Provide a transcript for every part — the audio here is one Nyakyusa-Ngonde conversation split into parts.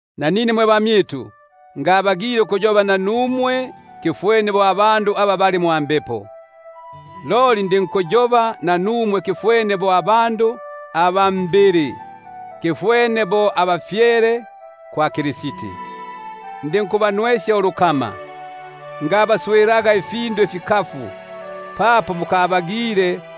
Nanine mwe bamyitu, ngabagile ukuyoba nanumwe bo abandu aba bali mwa Mbepo, loli ndinkuyoba nanumwe bo abandu aba mbili, bo ba bafyele mwa Kristi. Ndinkubanwesya ulukama, fyomma ifindu ifikafu; buno mukabagile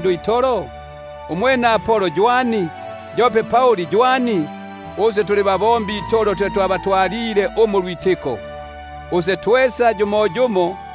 itolo? Umwene Apolo mfiki? Yope Pauli mfiki? Nikuti babombi itolo, muli aba mwalwagilemo ulwitiko; yumoyumo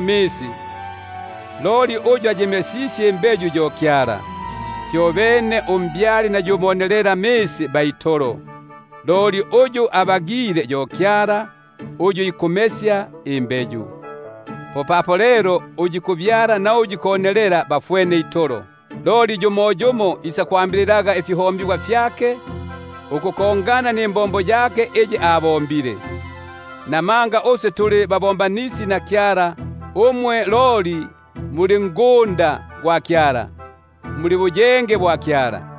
umwene loli Kyala yo alinkumesya. Fyobene umbyali na yu monelelamisi ba itolo, loli Kyala yo uyu ikumesya. Popapo lelo uyu ikubyala na uyu ikonelela bali yumoywene, loli yumoyumo isakwambililaga ifihombigwa ukufwana nimbombo yake. Namanga uswe tuli babombanisi na Kyala; umwe mwe ngunda gwa Kyala, mwe buyenge bwa Kyala.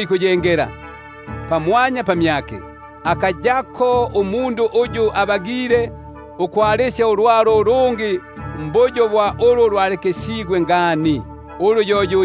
ikuyengela. Namanga nayumo akabagila ukwalisyapo ulwalo ulungi mumbali muli ulu lwalyalikisigwe ngani, ulu yo yu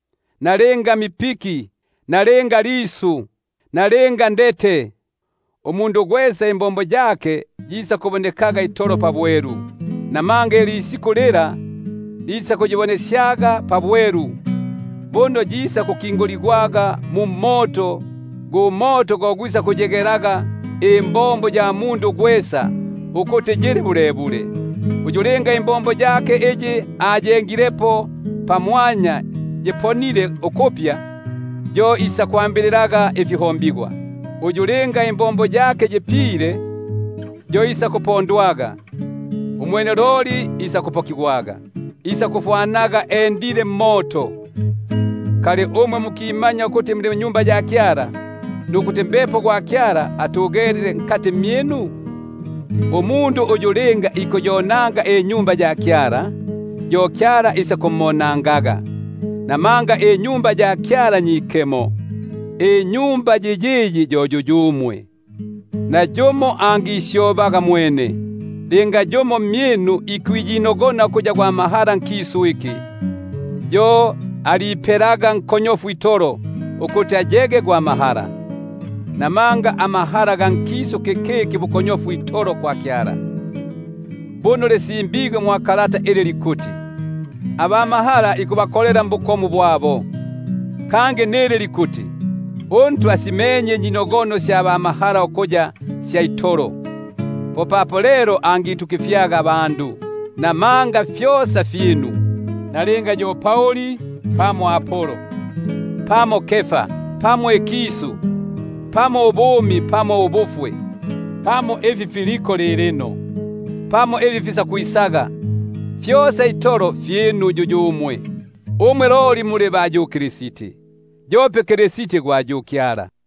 nalinga mipiki, nalinga lisu, nalinga ndete, umundu gwesa imbombo yake yisakubonekaga itolo pabwelu; namanga ilisiku fila lisakuyibonesyaga pabwelu; buno yisakukinguligwaga mu mmoto, gu moto go gwisakuyigelaga imbombo ya mundu gwesa ukuti yili bulebule. Uyu linga imbombo yake iyi ayengilepo pamwanya yiponile, yo isakwambililaga ifiho- mbigwa. Uyu linga imbombo yake yipile, yo isakupondwaga; umwene loli yo isakuponaga, loli isakufwanaga endilemo mmoto. Umwe mukamanya ukuti muli Tempeli gwa Kyala, nukuti Mbepo gwa Kyala atugele mmyinu? Uyu linga ikonanga Tempeli gwa Kyala, yo Kyala isakumonangaga; namanga Tempeli gwa Kyala yo mwikemo, uyu yo yuyumwe. Nayumo angisyobaga mwene. Linga yumo mmyinu ikwiyinogona ukuya gwa mahala nkisu iki, yo aliipelaga nkonyofu itolo, ukuti ayege gwa mahala. Namanga amahala ga nkisu kikiki bukonyofu itolo kwa Kyala. Buno lisimbigwe ili likuti: Aba mahala ikubakolela mbukomu bwabo; kangi nili likuti: UNtwa asimenye inyinogono sya ba mahala ukuya sya itolo. Popapo lelo nayumo angitukifyaga mbandu. Namanga fyosa fyinu; nalinga yo Pauli pamo Apolo, pamo Kefa, pamo ikisu, pamo ubumi pamo ubufwe, pamo ifi filiko lilino, pamo ifi fikwisaga; fyosa itolo fyinu yuyumwe; umwe loli muli ba yu Kristi, yope Kristi gwa yu Kyala.